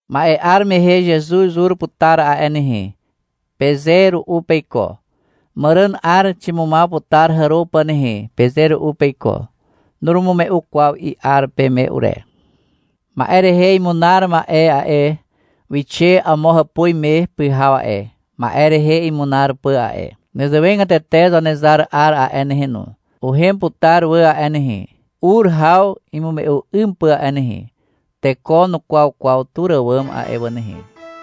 — Ma'e 'ar mehe Zezuz ur putar a'e nehe, peze ru'u peiko. — Màràn 'ar ximumaw putar hàro pà nehe, peze ru'u peiko. Nurumume'u kwaw i'ar peme ure. Ma'e rehe imunar ma'e a'e, wixe amo hàpuz me pyhaw a'e, ma'e rehe imunar pà a'e. Nezewegatete Zanezar 'ar a'e nehe no, uhem putar wà a'e nehe, ur haw imume'u 'ym pà a'e nehe. Teko nukwaw kwaw tur àwàm a'e wà nehe.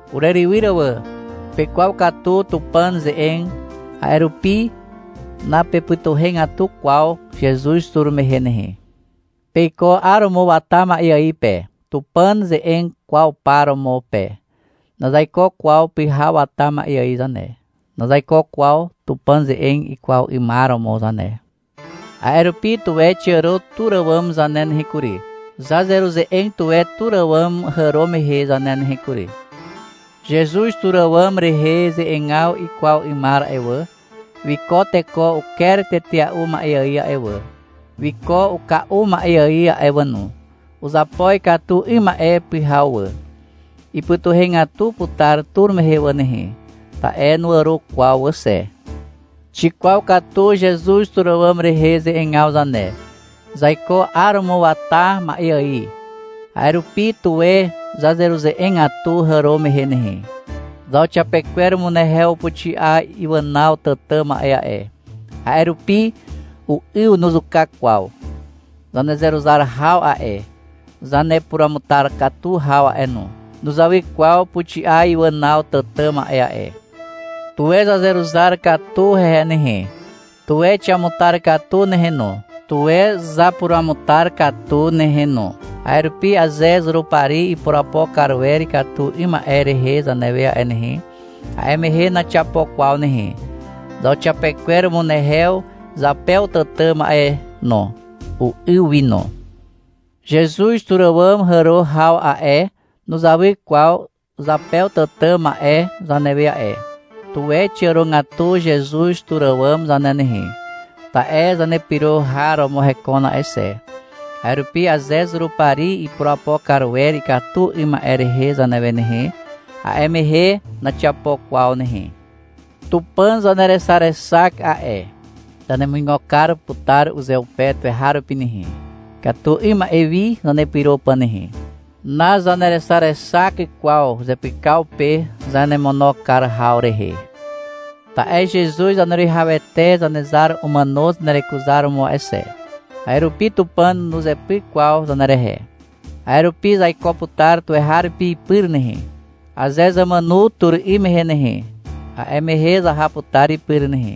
Urerywyr wà, pekwaw katu Tupàn ze'eg, a'e rupi napepytuhegatu kwaw Zezuz tur mehe nehe. Peiko 'aromo wata ma'e ài pe, Tupàn ze'eg kwaw par romo pe. Nazaiko kwaw pyhaw wata ma'e ài zane, nazaiko kwaw Tupàn ze'eg ikwaw 'ymar romo zane. A'e rupi, tuwe xiàro tur àwàm zane nehe kury. Zazeruze'eg tuwe tur àwàm hàro mehe zane nehe kury. Zezuz tur àwàm rehe ze'egaw ikwaw 'ymar a'e wà, wiko teko uker tetea'u ma'e ài a'e wà, wiko uka'u ma'e ài a'e wà no. Uzapo ikatu 'ym ma'e pyhaw wà. Ipytuhegatu putar tur mehe wà nehe, ta'e nuàro kwaw wà xe. Xikwaw katu Zezuz tur àwàm rehe ze'egaw zane. Zaiko 'aromo wata ma'e ài. A'e rupi, tuwe zazeruze'egatu hàro mehe nehe. Zauxiapekwer umunehew upuxi'a iwànaw tàtà ma'e a'e. A'e rupi u'yw nuzuka kwaw. Zanezeruzar haw a'e, zanepuruamutar katu haw a'e no, nuzawy kwaw puxi'a iwànaw tàtà ma'e a'e. Tuwe zazeruzar katu hehe nehe, tuwe xiamutar katu nehe no, tuwe zapuruamutar katu nehe no. A'e rupi aze Zurupari ipurapo kar wer ikatu 'ym ma'e rehe zanewe a'e nehe, a'e mehe naxiapo kwaw nehe. Zauxiapekwer umunehew zapew tàtà ma'e no, u'yw wi no. Zezuz tur àwàm hàro haw a'e, nuzawy kwaw zapew tàtà ma'e zanewe a'e. Tuwe xiàrogatu Zezuz tur àwàm zane nehe, ta'e zanepyro har romo hekon a'e xe. A'e rupi aze Zurupari ipurapo kar wer ikatu 'ym ma'e rehe zanewe nehe, a'e mehe naxiapo kwaw nehe. Tupàn zanerexarexak a'e. Zanemuigo kar putar uzeupe tuweharupi nehe, ikatu 'ym ma'e wi zanepyro pà nehe. Nazanerexarexak kwaw zepykaw pe zanemono kar haw rehe. Ta'e Zezuz Zaneruwihawete Zanezar umàno zanerekuzaromo a'e xe. A'e rupi Tupàn nuzepyk kwaw zanerehe. A'e rupi zaiko putar tuweharupi ipyr nehe. Aze zamàno tur 'ym mehe nehe, a'e mehe zaha putar ipyr nehe.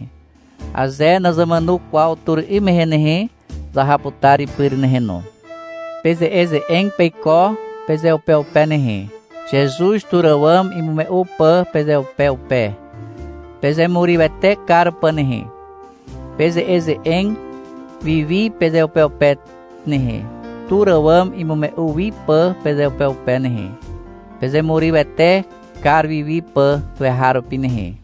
Aze nazamàno kwaw tur 'ym mehe nehe, zaha putar ipyr nehe no. Peze'eze'eg peiko pezeupeupe nehe, Zezuz tur àwàm imume'u pà pezeupeupe, pezemurywete kar pà nehe. Peze'eze'eg wiwi pezeupeupe nehe, tur àwàm imume'u wiwi pà pezeupeupe nehe, pezemurywete kar wiwi pà tuweharupi nehe.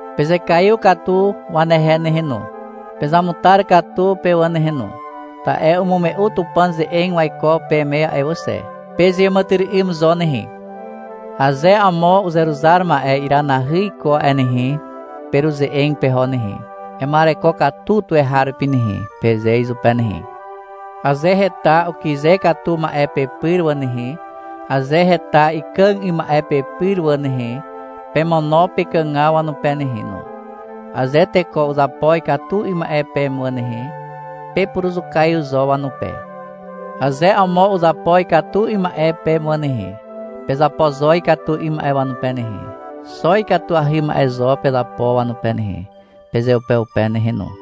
Pezekaiw katu wanehe nehe no. Pezamutar katu pe wà nehe no. Ta'e umume'u Tupàn ze'eg waiko peme a'e wà xe. Pezeàmàtyry'ym zo nehe. Aze amo uzeruzar ma'e iranahy iko a'e nehe, peruze'eg peho nehe. — Ema'ereko katu tuweharupi nehe, peze izupe nehe. Aze heta ukyze katu ma'e pepyr wà nehe, aze heta ikàg 'ym ma'e pepyr wà nehe, pemono pekàgaw wanupe nehe no. Aze teko uzapo ikatu 'ym ma'e peme wà nehe, pepuruzukaiw zo wanupe. Aze amo uzapo ikatu 'ym ma'e peme wà nehe, pezapo zo ikatu 'ym ma'e wanupe nehe. Xo ikatuahy ma'e zo pezapo wanupe nehe, pezeupeupe nehe no.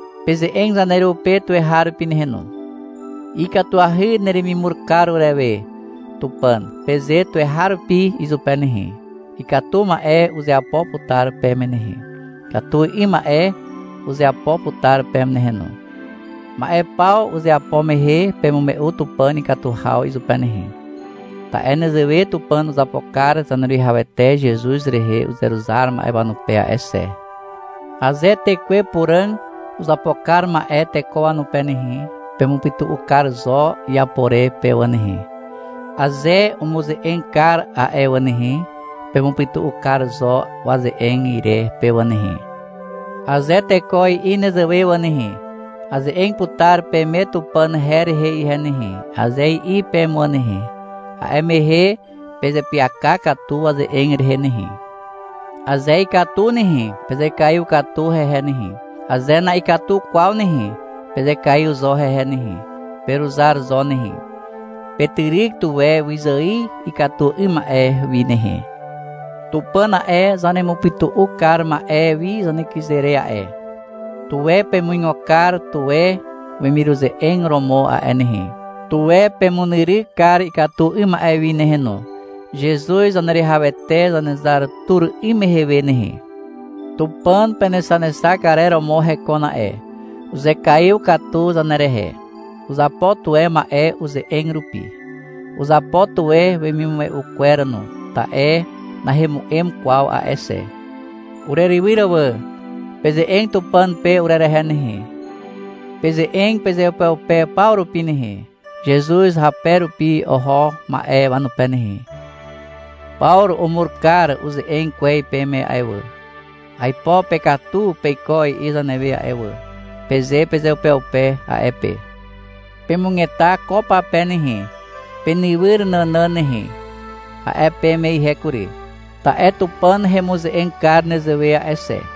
Peze'eg zaneru pe tuweharupi nehe no. — Ikatuahy neremimur kar urewe, Tupàn, peze tuweharupi izupe nehe. Ikatu ma'e uzeapo putar peme nehe. Ikatu 'ym ma'e uzeapo putar peme nehe no. Ma'e paw uzeapo mehe pemume'u Tupàn ikatu haw izupe nehe. Ta'e nezewe Tupàn uzapo kar Zaneruwihawete Zezuz rehe uzeruzar ma'e wanupe a'e xe. Aze Tekwe Puràg uzapo kar ma'e teko wanupe nehe, pemupytu'u kar zo iapo re pe wà nehe, aze umuze'eg kar a'e wà nehe, pemupytu'u kar zo waze'eg ire pe wà nehe. Aze teko i'i nezewe wà nehe, — Aze'eg putar peme Tupàn her rehe ihe nehe, aze i'i peme wà nehe, a'e mehe pezeapyaka katu waze'eg rehe nehe. Aze ikatu nehe, pezekaiw katu hehe nehe. Aze na'ikatu kwaw nehe, pezekaiw zo hehe nehe. Peruzar zo nehe. Petyryk tuwe wyzài ikatu 'ym ma'e wi nehe. Tupàn a'e, zanemupytu'u kar ma'e wi zanekyze re a'e. Tuwe pemuigo kar tuwe wemiruze'eg romo a'e nehe. Tuwe pemunyryk kar ikatu 'ym ma'e wi nehe no, Zezuz Zaneruwihawete Zanezar tur 'ym mehe we nehe. Tupàn penexanexak arer romo hekon a'e. Uzekaiw katu zanerehe. Uzapo tuwe ma'e uze'eg rupi. Uzapo tuwe wemimume'u kwer no, ta'e nahemu'em kwaw a'e xe. Urerywyr wà. Peze'eg Tupàn pe urerehe nehe. Peze'eg pezeupeupe paw rupi nehe, Zezuz hape rupi oho ma'e wanupe nehe. — Pawru umur kar uze'eg kwez peme a'e wà. — Aipo pekatu peiko, i'i zanewe a'e wà, peze pezeupeupe a'e pe. — Pemugeta ko pape nehe, penywyr nànàn nehe, a'e peme ihe kury, ta'e Tupàn hemuze'eg kar nezewe a'e xe.